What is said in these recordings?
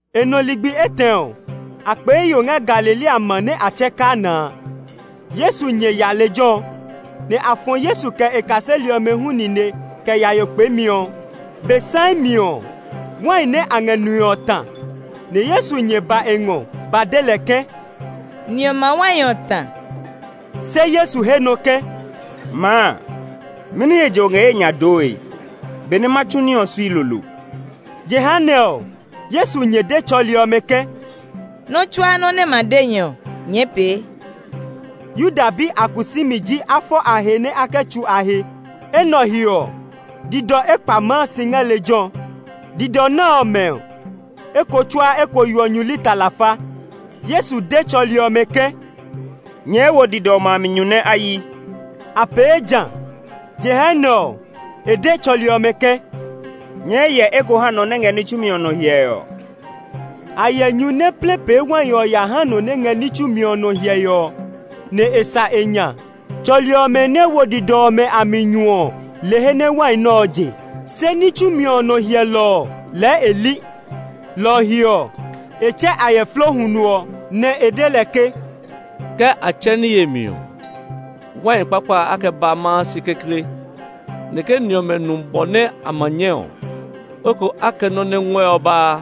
E nɔ ligbi etɛ ɔ, a kpee yo ngɛ Galilea ma nɛ a tsɛɛ Kana a. Yesu nyɛ ya lejɛ ɔ; nɛ a fɔ Yesu kɛ e kaseli ɔmɛ hu nine kɛ ya yo kpeemi ɔ. Be saii mi ɔ, wai nɛ a ngɛ nue ɔ ta; nɛ Yesu nyɛ ba e ngɔ ba de lɛ ke, “Ni ɔmɛ a wai ɔ ta.” Se Yesu he nɔ ke, “Maa, mɛni he je o ngɛ ye nya dooe? Be nɛ ma tsu ní ɔ sui lolo.” Jehanɛ ɔ Yesu nyɛ de tsɔli ɔmɛ ke, “Nɔ́ tsuaa nɔ́ nɛ e ma de nyɛ ɔ, nyɛɛ pee.” Yuda bi a kusumi ji a fɔ a he nɛ a kɛ tsú a he. Enɛ ɔ he ɔ, didɔ ekpa maa si ngɛ lejɛ ɔ. Didɔ nɛ ɔmɛ ɔ, eko tsuaa eko yeɔ nyu lita lafa. Yesu de tsɔli ɔmɛ ke, “Nyɛɛ wo didɔ ɔmɛ a mi nyu nɛ a hyi.” A pee jã. Jehanɛ ɔ, e de tsɔli ɔmɛ ke, “Nyɛɛ yɛ eko ya ha nɔ nɛ ngɛ ní tsumi ɔ nɔ hyɛe ɔ.” A yɛ nyu nɛ plɛ pee wai ɔ ya ha nɔ nɛ ngɛ ní tsumi ɔ nɔ hyɛe ɔ, nɛ e sa e nya. Tsɔli ɔmɛ nɛ wo didɔ ɔmɛ a mi nyu ɔ le he nɛ wai nɛ ɔ je; se ní tsumi ɔ nɔ hyɛlɔ ɔ lɛɛ e li. Lɔ ɔ he ɔ, e tsɛ ayɛflo huno ɔ, nɛ e de lɛ ke, “Ke a tsɛ ní yemi ɔ, wai kpakpa a kɛ ba maa si kekle; nɛ ke ni ɔmɛ nu bɔ nɛ a ma nyɛ ɔ loko a kɛ nɔ́ nɛ ngɔɛ ɔ baa.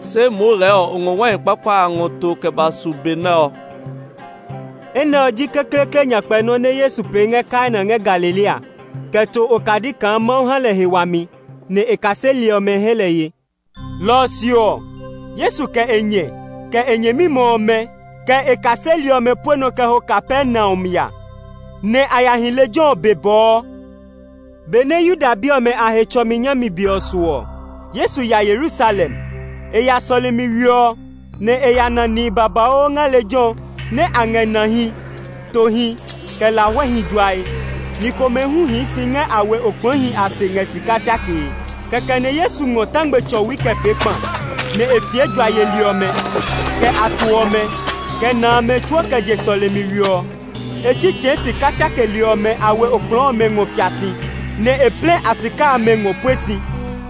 Se moo lɛɛ o ngɔ wai kpakpa a ngɔ to kɛ ba su be nɛ ɔ.” Enɛ ɔ ji kekleekle nyakpɛ nɔ́ nɛ Yesu pee ngɛ Kana ngɛ Galilea kɛ to okadi kaa Mawu ha lɛ he wami; nɛ e kaseli ɔmɛ he lɛ ye. Lɔ ɔ se ɔ, Yesu kɛ e nyɛ, kɛ e nyɛmimɛ ɔmɛ, kɛ e kaseli ɔmɛ pue nɔ kɛ ho Kapernaum ya, nɛ a ya hi lejɛ ɔ be bɔɔ. Benɛ Yuda bi ɔmɛ a Hetsɔmi nyami be ɔ su ɔ, Yesu ya Yerusalem. E ya sɔlemi we ɔ, nɛ e ya na nihi babauu ngɛ lejɛ ɔ nɛ a ngɛ nahi, tohi, kɛ lahuɛhi juae. Ni komɛ hu hii si ngɛ a we okplɔɔhi a se ngɛ sika tsakee. Kɛkɛ nɛ Yesu ngɔ tangme tsɔwi kɛ pee kpa, nɛ e fie jua yeli ɔmɛ, kɛ a to ɔmɛ, kɛ na amɛ tsuo kɛ je sɔlemi we ɔ. E tsitsɛɛ sika tsakeli ɔmɛ a we okplɔɔ ɔmɛ ngɔ fia si, nɛ e plɛ a sika amɛ ngɔ pue si.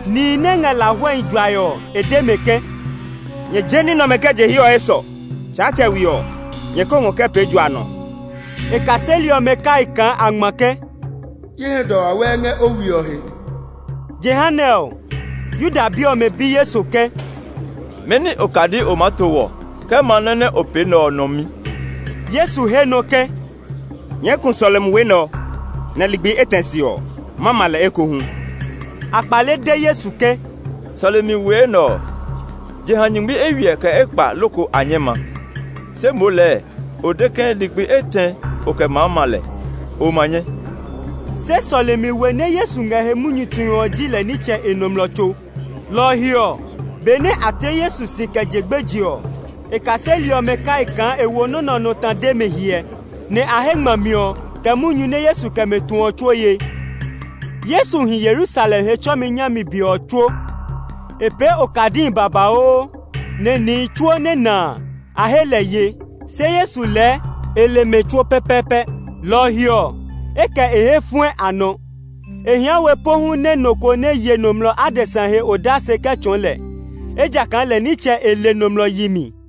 Nihi nɛ ngɛ lahuɛhi juae ɔ, e de mɛ ke, “Nyɛ je ní nɛ ɔmɛ kɛ je hiɛ ɔ esɔ! Tsaatsɛ we ɔ, nyɛ ko ngɔ kɛ pee jua nɔ.” E kaseli ɔmɛ kai kaa a ngma ke, “Ye hɛ dɔ wawɛɛ ngɛ o we ɔ he.” Jehanɛ ɔ, Yuda bi ɔmɛ bi Yesu ke, “Mɛni okadi o maa to wɔ kɛ ma nɔ́ nɛ o pee nɛ ɔ nɔ mi?” Yesu he nɔ ke, “Nyɛɛ ku sɔlemi we nɛ ɔ, nɛ ligbi etɛ se ɔ, ma ma lɛ ekohu.” A kpale de Yesu ke, “Sɔlemi we nɛ ɔ, jeha nyingmi eywiɛ kɛ ekpa loko a nyɛ ma; se moo lɛɛ o de ke ligbi etɛ o kɛ maa ma lɛ; o ma nyɛ?” Se sɔlemi we nɛ Yesu ngɛ he munyu tue ɔ ji lɛ nitsɛ e nɔmlɔ tso. Lɔ ɔ he ɔ, benɛ a tle Yesu si kɛ je gbeje ɔ, e kaseli ɔmɛ kai kaa e wo nɔ́ nɛ ɔ nɔ ta de mɛ hyɛ, nɛ a he ngmami ɔ, kɛ munyu nɛ Yesu kɛ mɛ tu ɔ tsuo ye. Yesu hi Yerusalem Hetsɔmi nyami be ɔ tsuo. E pee okadihi babauu, nɛ nihi tsuo nɛ na a, a he lɛ ye. Se Yesu lɛɛ e le mɛ tsuo pɛpɛɛpɛ, lɔ ɔ he ɔ, e kɛ e hɛ fɔɛ a nɔ. E hia we pohu nɛ nɔ ko nɛ ye nɔmlɔ adesa he odase kɛ tsɔɔ lɛ, ejakaa lɛ nitsɛ e le nɔmlɔ yi mi.